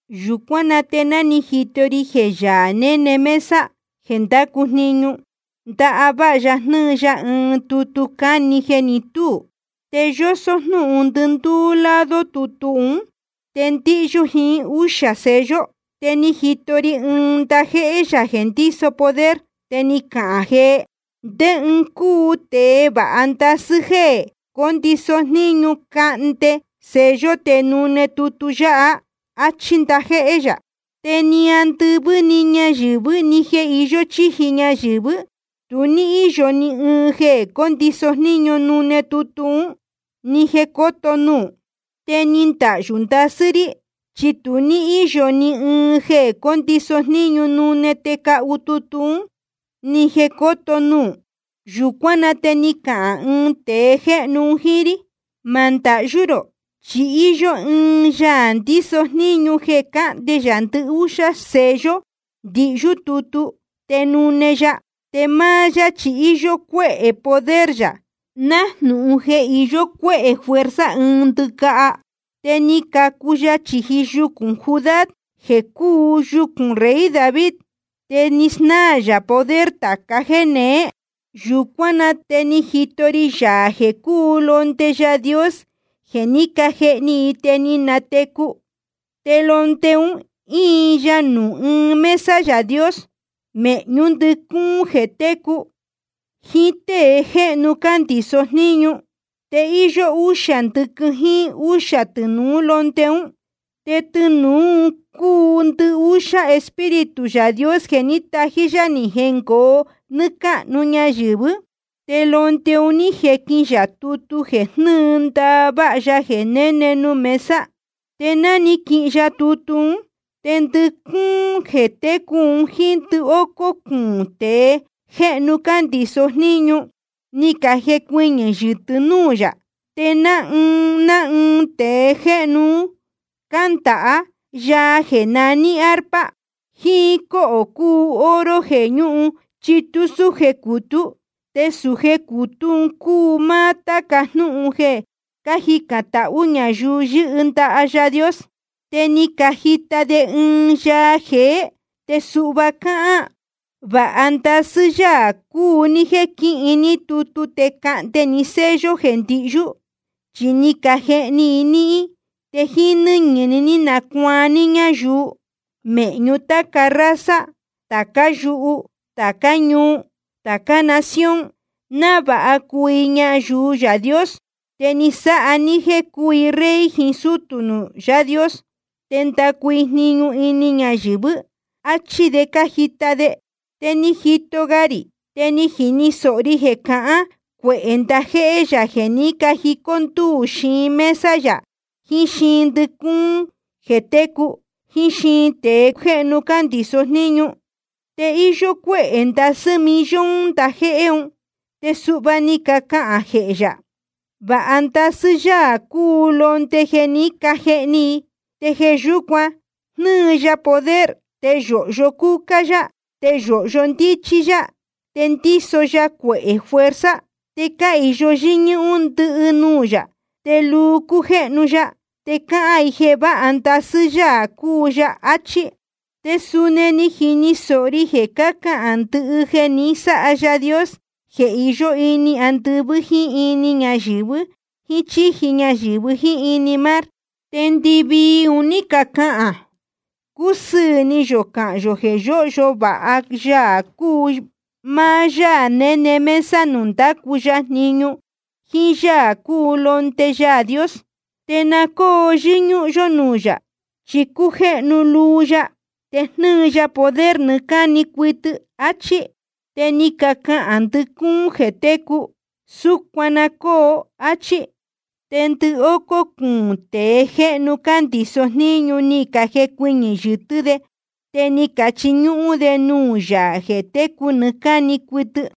Yūcuán na te ni jito ri jeē Yaā néne mesa jeē ndácu jniñu, ndaváha ya jnɨ́ɨ ya ɨɨn tutu cáni jeē ní tuu. Te yósó jnúhun ndɨndúú lado tutu ún, te ndíhyú jiín úxā sello. Te ni jito ri ɨɨn ndajéhé yā jeē ndíso poder, te ni cahān jee: ¿Ndé ɨɨn cúu tēe vāha ndasɨ́ jeē cóndiso jníñu cahnde sello te nune tutu yáha? áchí ndajéhé yā. Te ni andɨvɨ́ ni ñayɨ̄vɨ́ ni jeē iyó chíji ñayɨ̄vɨ́, tu ní íyo ni ɨɨn jeē cóndiso jníñu nune tutu ún, ni jeē cóto nuū. Te ni ndahyū ndasɨ́ rí, chi tu ní íyo ni ɨɨn jeē cóndiso jníñu nune te cahu tutu ún, ni jeē cóto nuū. Yūcuán na te ni cahān ɨɨn tēe jéhnu un jíín rí: Ma ndahyú rō, chi íyó ɨɨn Yaā ndíso jníñu jeē cahnde yā ndɨhúxá sello ndihyú tutu, te nune ya. Te máá yá chi íyó cuéhē poder yā, nájnūhun jeē iyó cuéhē fuerza ɨɨn ndɨcaha. Te ni cacu ya chīji yucūn Judá, jeē cúu yucūn rey David. Te ni snáā yā poder tāca jéneé. Yūcuán na te ni jito ri Yaā jeē cúu Londe Yaā Dios jeē ní cajehni i te ni natecu. Te Londe un íin ya nuū íin mesa Yaā Dios, mēhñú ndɨcúún jeē técu, jiín tée jéhnu cándiso jníñu. Te íyó úxā ndɨquɨ jíín úxā tɨnūú Londe ún. Te tɨnūú un cúu ndɨhúxá Espíritu Yaā Dios jeē ní tají yá ni jengoo nɨ́ɨ́ cáhnu ñayɨ̄vɨ́. Te Londe un ní jequīhin ya tutu jeē jnɨ́ɨ ndaváha Yaā jeē néne nuū mesa. Te ná ni quihin ya tutu ún, te ndɨcúún jeē técu jiín ndɨhócó cuūn tēe jéhnu cándiso jníñu, ni cajecuɨñɨ̄ yɨtɨ́ núū yā. Te ná ɨɨn ná ɨɨn tēe jéhnu un cándaha yaa jeē naní arpa, jíín cóhō cūu oro jeē ñúhun chitú súje cutú. Te sūje cutú un cúu máá táca jnúhun jeē cájicān tahú ñayuu yɨ́hɨ ndaha Yaā Dios. Te ni cajita de ɨɨn yaa jeé, te suhva cáhán: Vāha ndasɨ́ Yaā cúu ní jéē quihin ní tutu te cahnde ni sello jeē ndihyú. Chi ni cajehni i níhín, te jíín nɨ́ñɨ̄ ni ní nacuaan ní ñayuu mēhñu táca raza, tācá yuhu, tācá ñuu, tācá nación, návāha cuu i ñayuu Yaā Dios. Te ni sáha ní jéē cuu i rey jiín sútū nuū Yaā Dios, te ndacu i jniñu ini ñayɨ̄vɨ́. Achí de cájita de. Te ni jito ga rī, te ni jini sōho ri jeē cácahān cuehē ndajéhé yā jeē ní cajicó ndúū xiin mesa yā, jiín xiin ndɨcúún jeē técu, jiín xiin tēe jéhnu cándiso jníñu. Te íyó cuéhē ndasɨ́ millón ndajéhé un. Te suhva ni cacahān jee ya: Vāha ndasɨ́ Yaā cúu Londe jeē ní cajehni i. Te jeē yúcuan jnɨ́ɨ ya poder, te yōhyo cúcá yá, te yōhyo ndíchí yá, te ndíso ya cuehē fuerza, te cáhīyo yɨ́ñúhún ndɨhɨ nuū yā, te luu cújéhnu ya, te cácahān i jeē váha ndasɨ́ Yaā cúu ya. Achí. Te suni ni jini sōho ri jeē cácahān ndɨhɨ jeē ni sáha Yaā Dios jeē iyó ini andɨvɨ́ jíín ini ñayɨ̄vɨ jíín chīji ñayɨ̄vɨ jíín ini mar. Te ndɨvii un ní cacahān: Cúsɨɨ̄ ni yō cahán yō jeē yóhyo vāha Yaā cúu máá Yaā néne mesa nuū ndácu ya jniñu, jíín Yaā cúu Londe Yaā Dios. Te na cóo yɨ́ñúhún yó núū yā, chi cújéhnu luu ya, te jnɨ́ɨ ya poder nɨɨ́ cáni cuɨtɨ. Achí. Te ni cacahān ndɨcúún jeē técu: Súcuan na cóo, áchí. Te ndɨhócó cuūn tēe jéhnu cándiso jníñu ni cajecuɨñɨ̄ yɨtɨ́ de, te ni cachiñúhún de nuū Yaā jeē técu nɨɨ́ cáni cuɨtɨ.